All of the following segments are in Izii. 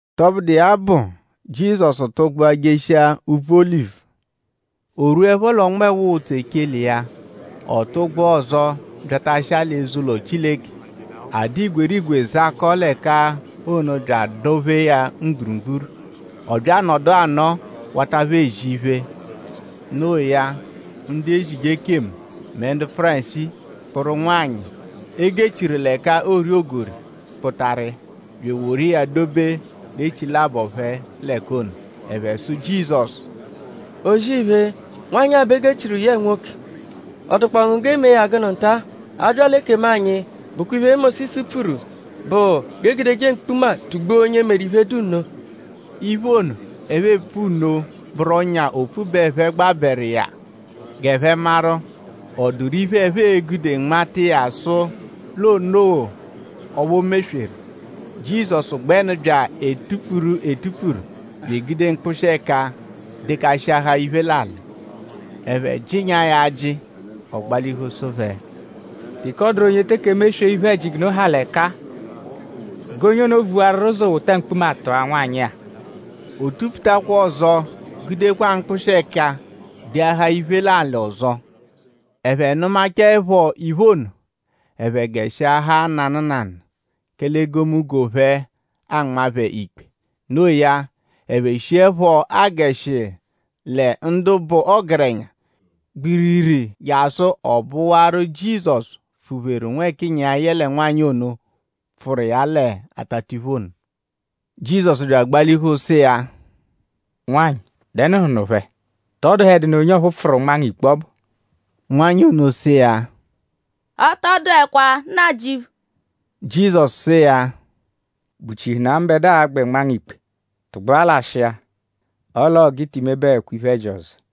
Tọbudu iya bụ; Jizọsu tụgbua jeshia úbvú Olivu. O rwuẹpho l'ọnmewa ụtsu echele iya; ọ tụgbua ọzo byatashia l'eze-ụlo Chileke. A dụ igwerigwe zakọo l'ẹka ono bya adọ-phee ya mgburugburu. Ọ bya anọdu anọo; wata phẹ ezi iphe. No iya; ndu ezije ekemu mẹ ndu Fárisii kpụru nwanyị, e gechiru l'ẹka oori ogori kpụtaru iya; bya eworu iya dobe l'echilabọ phẹ l'ẹka ono. Ẹphe sụ Jizọsu: “O-zì-iphe! Nwanyị-a bẹ e gechiru yẹe nwoke. ?Ọ dụkpoo ngu g'e mee ya gụnu nta-a? A -bya l'ekemu anyi bụkwa iphe, Mósisu pfuru bụ g'e gudeje mkpuma tugbua onye meru iphe, dụ nno.” Iphe ono, ẹphe epfu nno bụru ọ́nyà opfu bẹ ẹphe gbabẹru iya g'ẹphe maru:?ọ dụru iphe, ẹphe e-gude nmata iya sụ l'o noo ọphu o mesweru. Jizọsu gbẹnu bya etupfuru etupfuru bya egude mkpụshi-ẹka dekashịahaa iphe l'alị. Ẹphe jịnyaa ya ajị; ọ gbalihu sụ phẹ: “Teke ọ dụru onye teke emeswee iphe-ẹji g'unu ha l'ẹka-a g'onye ono vuwarurọ ụzo wota mkpuma tụa nwanyị-a.” O tupfutakwa ọzo gudekwa mkpụshi-ẹka deahaa iphe l'alị ọzo. Ẹphe nụmachaepho iphe ono; ẹphe gẹshihuahaa nanụ nanụ; kẹle egomunggo phẹ anmaa phẹ ikpe. No iya; ẹphe shiẹpho agẹshihu lẹ ndu bụ ọgerenya gbiriri jasụ ọ bụwaru Jizọsu pfụ-pheru nwẹkiya yẹle nwanyị ono, pfụru iya l'atatiphu ono. Jizọsu bya agbalihu sụ iya: “Nwanyị!?Dẹnuhunu phẹ??Tọ dụhedunu onye ọphu pfụru nma ngu ikpe ọbu?” Nwanyị ono sụ iya: “Ọ tọ dụekwa Nnajịuphu.” Jizọsu sụ iya: “?Bụchihunaa mbẹdua a-gbẹ nmaa ngu ikpe? Tụgbua lashịa. Ọ l'ọo g'i ti mebẹkwa iphe-ẹji ọzo.”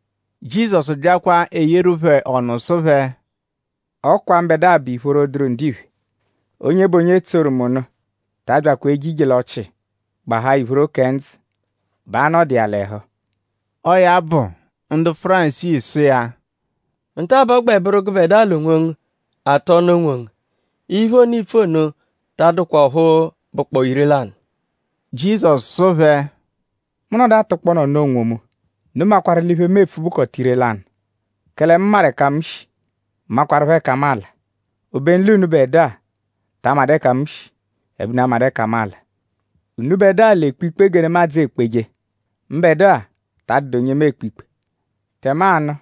Jizọsu byakwa eyeeru phẹ ọnu sụ phẹ: “Ọ kwa mbẹdua bụ ìphóró, dụru ndiphe. Onye bụ onye tsoru mu nụ ta abyakwa eje ije l'ọchii; gbahaa ìphóró kẹ ndzụ bẹ a-nọdu iya l'ẹhu.” Ọo ya bụ; ndu Fárisii sụ iya: “Nta-a bẹ ọ gbẹ bụru gụbedua l'onwongu atụ ọnu onwongu. Iphe ono, iipfu ono ta adụkwa ọphu bụkpoo ire-lanụ.” Jizọsu sụ phẹ: “Mu -nọdu atụkpoonu ọnu onwomu; unu makwarụ l'iphe, mu epfu bụkota ire-lanụ; kẹle mu maru ẹka mu shi; makwarụpho ẹka mu ala; obenu l'unubẹdua ta amadụ ẹka mu shi; ẹbe unu amadụ ẹka mu ala. Unubẹdua l'ekpe ikpe gẹ nemadzụ ekpeje. Mbẹdua ta adụdu onye mu ekpe ikpe. Tẹmanu;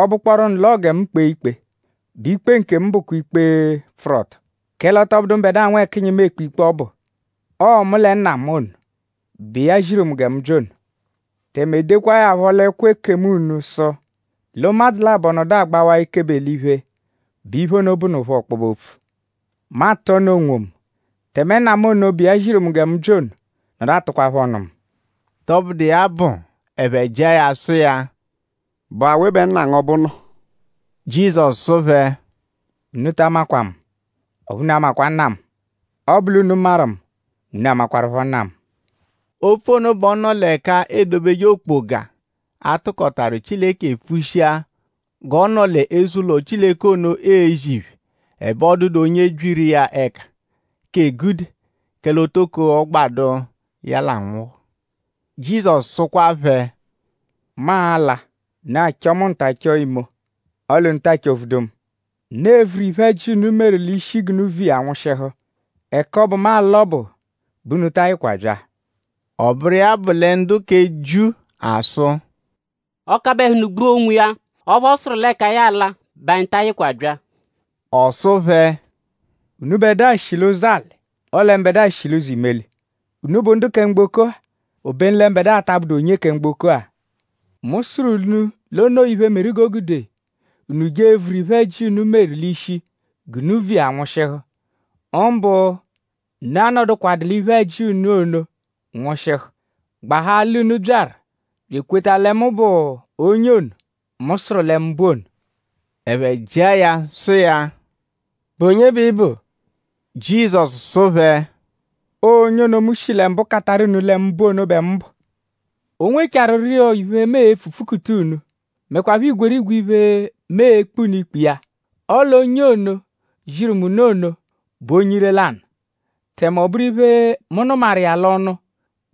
ọ -bụkpooru nụ l'ọo gẹ mu kpee ikpe; bẹ ikpe nkemu bụkwa ikpe, pfụru ọto; kẹle ọ tọ bụdu mbẹdua nwẹkinyi mu ekpe ikpe ọbu. Ọo mu lẹ Nna mu ono, bụ iya ziru mu gẹ mu bya ono. Tẹme e dekwaa ya phọ l'ẹkwo ekemu unu sụ l'ụmadzu labọ -nọdu agbawaa ekebe l'iphe bẹ iphe ono bụnupho ọkpobe-opfu. Mu atụ ọnu onwomu; tẹme Nna mu ono, bụ iya ziru mu gẹ mu bya ono nọdu atụkwapho ọnu mu.” Tọbudu iya bụ; ẹphe jịa ya sụ iya: “?Bụ awe bẹ Nna ngu ọbu nọ?” Jizọsu sụ phẹ: “Unu ta amakwa mu; ọphu unu amakwa Nna mu. Ọ -bụ l'unu maru mu mẹ unu amakwarụpho Nna mu.” Opfu ono bẹ ọ nọ l'ẹka e dobeje okpoga, a tụkotaru Chileke pfushia g'ọ nọ l'eze-ụlo Chileke ono ezi iphe. Ẹbe ọ dụdu onye byiru iya ẹka k'egude; kẹle o toko ọ gbadụ iya l'anwụhu. Jizọsu sụkwa phẹ: “Mu a-la; unu achọo mu nta chọo imo; ọle unu taa chọ-vudu mu. Unu evuru iphe-ẹji, unu meru l'ishi g'unu vu iya nwụshihu. Ẹka ọbu, mu a-la ọbu bẹ unu ta ayịkwa bya.” Ọ bụru iya bụ lẹ ndu kẹ Jiu asụ: “?Ọo-kabẹhunu gbua onwiya ọphu ọ sụru l'ẹka ya a-la bẹ anyi ta ayịkwa bya?” Ọ sụ phẹ: “Unubẹdua shi l'ụzo-alị; ọle mbẹdua shi l'ụzo-imeli. Unu bụ ndu kẹ mgboko-a; obenu lẹ mbẹdua ta abụdu onye kẹ mgboko-a. Mu sụru unu l'o noo iphe, meru g'o gude unu je evuru iphe-ẹji, unu meru l'ishi g'unu vu iya nwụshihu; mbụ unu a-nọdukwa l'iphe-ẹji unu ono nwụshihu; gbahaa l'unu byaru bya ekweta lẹ mu bụ onye ono, mu sụru lẹ mu bụ ono.” Ẹphe jịa ya sụ iya: “?Bụ onye bẹ ị bụ?” Jizọsu sụ phẹ: “Ọo onye ono, mu shi lẹ mbụ kataru unu lẹ mu bụ ono bẹ mu bụ. O nwechaarụro iphe, mu e-pfu pfukuta unu; mẹkwapho igwerigwe iphe, mu e-kpe unu ikpe iya; ọle onye ono, ziru mu nụ ono bụ onye ire-lanụ; tẹme ọ bụru iphe, mu nụmaru iya l'ọnu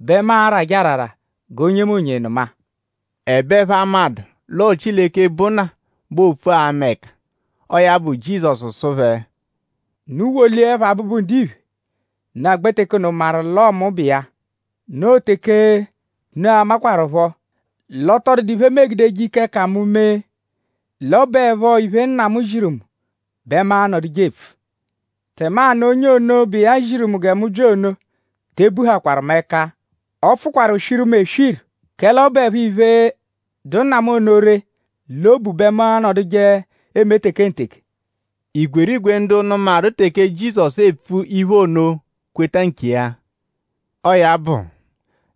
bẹ mu arajẹ arara g'onyemonye nụma.” Ẹbe ẹphe amadụ l'ọo Chileke, bụ Nna bẹ oopfu ama ẹka. Ọo ya bụ Jizọsu sụ phẹ: “Unu -woliẹpho Abụbu-Ndiphe; unu agbẹ teke ono maru l'ọo mu bụ iya. Noo teke unu a-makwarụpho l'ọ tọ dụdu iphe, mu egudeje ike k'ẹka mu mee; l'ọ bụepho iphe, Nna ziru mu bẹ mu anọduje epfu. Tẹmanu onye ono, bụ iya ziru mu gẹ mu bya ono te ebuhakwaru mu ẹka. Ọ pfụkwaru swiru mu eswiru; kẹle ọ bụepho iphe, dụ Nna mu ono ree l'obu bẹ mu anọduje eme tekenteke.” Igwerigwe ndu nụmaru teke Jizọsu epfu iphe ono kweta nkiya. Ọo ya bụ;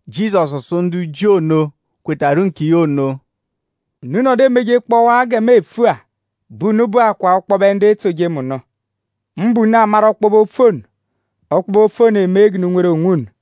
Jizọsu sụ ndu Jiu ono, kwetawaru nkiya ono: “Unu -nọdu emejekpọwaa gẹ mu epfu-a; bẹ unu bụakwaa ọkpobe ndu etsoje mu nụ. Mbụ; unu amaru ọkpobe-opfu ono. Ọkpobe-opfu ono emee g'unu nweru onwunu.”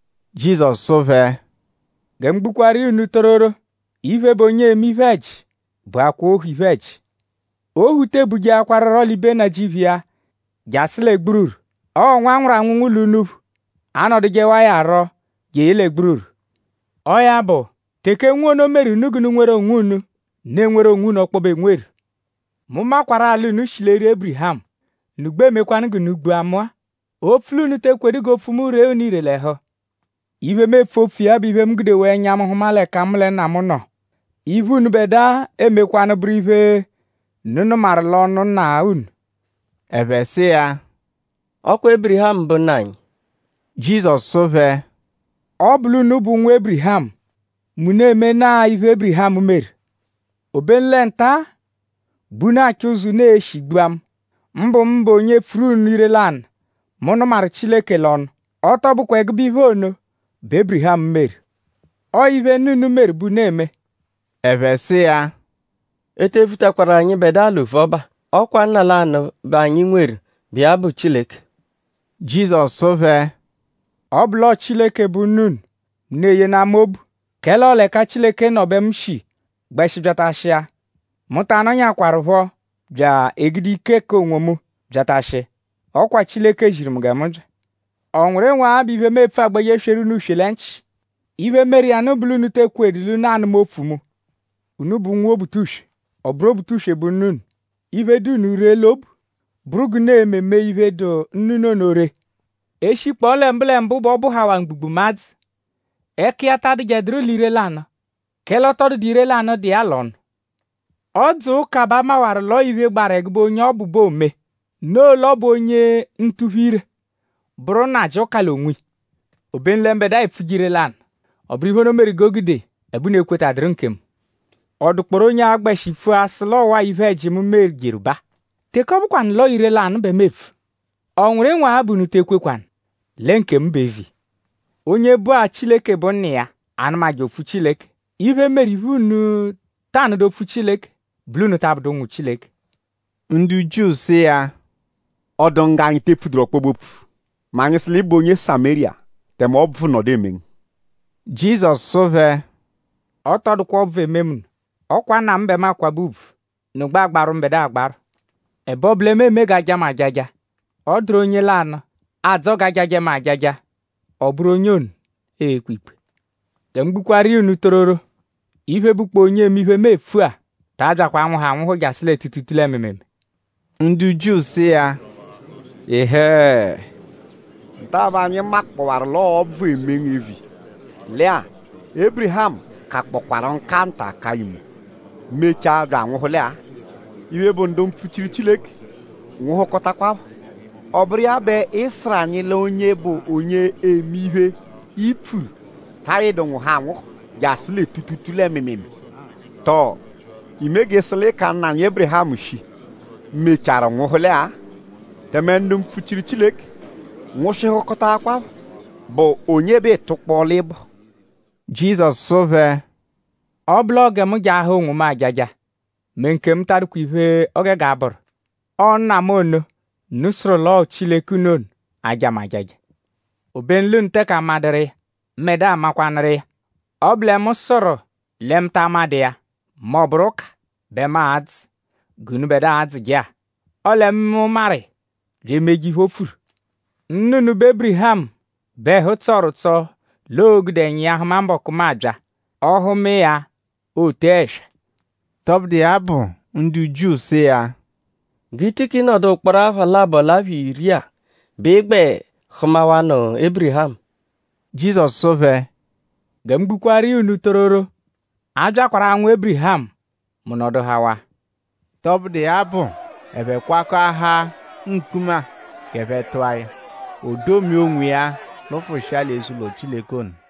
Jizọsu sụ phẹ: “Gẹ mu gbukwaaru iya unu tororo; iphe, bụ onye eme iphe-ẹji bụakwaa ohu iphe-ẹji. Ohu te ebujeakwarurọ l'ibe nnajịuphu iya jasụ lẹ gbururu. Ọo nwa, a nwụru anwụnwu l'unuphu anọdujewa iya rọ jeye lẹ gbururu. Ọo ya bụ; teke Nwa ono meru unu g'unu nweru onwunu; unu enweru onwunu ọkpobe enweru. Mu makwarụ-a l'unu shi l'eri Ébirihamu; unu gbẹ emekwanụ g'unu gbua mu-a; opfu l'unu te ekwedu g'opfu mu ree unu ire l'ẹhu. Iphe, mu epfu opfu iya bụ iphe, mu gudewaa ẹnya mu hụma l'ẹka mu lẹ Nna nọ; iphe, unubẹdua emekwanụ bụru iphe, unu nụmaru l'ọnu nna unu.” Ẹphe sụ iya: “Ọ kwa Ébirihamu bụ Nna anyi.” Jizọsu sụ phẹ: “Ọ -bụ l'unu bụ ụnwu Ébirihamu mẹ unu emenaa iphe, Ébirihamu meru. Obenu lẹ nta-a bẹ unu achọ ụzo, unu e-shi gbua mu; mbụ mụbe onye pfuru unu ire-lanụ, mu nụmaru Chileke l'ọnu. Ọ tọ bụkwa ẹgube iphe ono bẹ Ébirihamu meru. Ọo iphe, nna unu meru bẹ unu eme.” Ẹphe sụ iya: “E te vutakwaru anyịbedua l'ovuọba. Ọ kwa Nna lanụ bẹ anyi nweru, bụ iya bụ Chileke.” Jizọsu sụ phẹ: “Ọ -bụ l'ọo Chileke bụ Nna unu mẹ unu eyenaa mu obu; kẹle ọo l'ẹka Chileke nọ bẹ mu shi gbẹshi byatashia. Mu ta anọnyaekwarupho bya egude ike k'onwomu byatashia. Ọ kwa Chileke ziru mu gẹ mu bya. ?Ọ nwụru ịnwu-agha bẹ iphe, mu epfu agbẹje sweru unu uswe lẹ nchị? Iphe, meru iya nụ bụ l'unu te ekwedu l'unu a-nụma opfu mu. Unu bụ ụnwu Obutuswe. Ọ bụru Obutuswe bụ nna unu. Iphe, dụ unu ree l'obu bụru g'unu e-me mee iphe, dụ nna unu ono ree. E -shikpọo lẹ mbụlembu bẹ ọ bụhawaa mgbugbụmadzu. Ẹka iya ta adụjeduru l'ire-lanụ; kẹle ọ tọ dụdu ire-lanụ dụ iya l'ọnu. Ọ -dzụa ụka bẹ a mawaru l'ọo iphe, gbaru ẹgube onye ọ bụ bẹ oome; noo l'ọ bụ onye ntuphu-ire bụru nnajị ụka l'onwiya. Obenu lẹ mbẹdua epfuje ire-lanụ. Ọ bụru iphe ono meru g'o gude ẹbe unu ekwetaduru nkemu. ?Ọ dụkpooru onye a-gbẹshi pfua sụ l'ọwa-a iphe-ẹji, mu mejeru baa? Teke ọ bụkwanu l'ọo ire-lanụ bẹ mu epfu;?ọ nwụru ịnwu-agha bẹ unu te ekwekwanụ lẹ nkemu bụ eviya? Onye bụ-a Chileke bụ Nna iya anụmaje opfu Chileke. Iphe, meru iphe, unu ta anụdu opfu Chileke bụ l'unu ta abụdu ụnwu Chileke.” Ndu Jiu sụ iya: “?Ọ dụ ngu g'anyi te epfuduru ọkpobe-opfu mẹ anyi -sụ l'ị bụ onye Samériya; tẹme ọbvu nọdu eme ngu?” Jizọsu sụ phẹ: “Ọ tọ dụkwa ọbvu, eme mu nụ. Ọ kwa Nna mu bẹ mu akwabẹ ùbvù; unu gbẹ agbarwụ mu agbarwụ; ẹbe ọ bụ lẹ mu eme g'a jaa mu ajaja. Ọ dụru onye lanụ, adzọ g'a jajẹ mu ajaja; ọ bụru onye ono e-kpe ikpe. Gẹ mu gbukwaaru iya unu tororo; iphe, bụkpoo onye eme iphe, mu epfu-a ta abyakwa anwụhu anwụhu jasụ lẹ tuutuutuu lẹ mịimiimii.” Ndu Jiu sụ iya: “Ịhee! Nta-a bẹ anyi makpọwaru l'ọo ọbvu eme ngu eviya. Lẹ-a; Ébirihamu kakpọkwaru nka nta ka imo; mechaa bya anwụhule-a. Iphe, bụ ndu mpfuchiru Chileke nwụhukotakwapho; ọ bụru iya bẹ ị sụru anyi l'onye bụ onye eme iphe, i pfuru ta ayịdu nwụhu anwụhu jasụ lẹ tuutuutuu lẹ mịimiimii. Tọo?iime g'ị sụ l'ị ka nna anyi Ébirihamu shii, mechaarụ nwụhuela-a? Tẹme ndu mpfuchiru Chileke nwụshihukotakwapho.?Bụ onye bẹ iitukpọ l'ị bụ?” Jizọsu sụ phẹ: “Ọ -bụ l'ọo gẹ mu jaahaa onwomu ajaja mẹ nkemu ta adụkwa iphe, o gege abụru. Ọo Nna mu ono, unu sụru l'ọo Chileke unu ono aja mu ajaja. Obenu l'unu teke amadụru iya; mbẹdua makwanụru iya. Ọ -bụ lẹ mu sụru lẹ mu ta amadụ iya m'ọ bụru ụka bẹ mu adzụ g'unubẹdua adzụje-a. Ọle mu maru iya bya emeje iphe, o pfuru. Nna unu, bụ Ébirihamu bẹ ẹhu tsọru ụtso l'oo-gude ẹnya iya hụma mbọku, mu a-bya. Ọ hụma iya; o tee ẹswa.” Tọbudu iya bụ; ndu Jiu sụ iya: “?G'i tikị nọdu ụkporo apha labọ l'apha iri-a bẹ ị gbẹ hụmawanu Ébirihamu?” Jizọsu sụ phẹ: “Gẹ mu gbukwaaru iya unu tororo; a byakwaru anwụ Ébirihamu; mu nọduhawaa.” Tọbudu iya bụ; ẹphe kwakọahaa mkpuma g'ẹphe tụa ya. O domia onwiya; lụfushia l'eze-ụlo Chileke ono.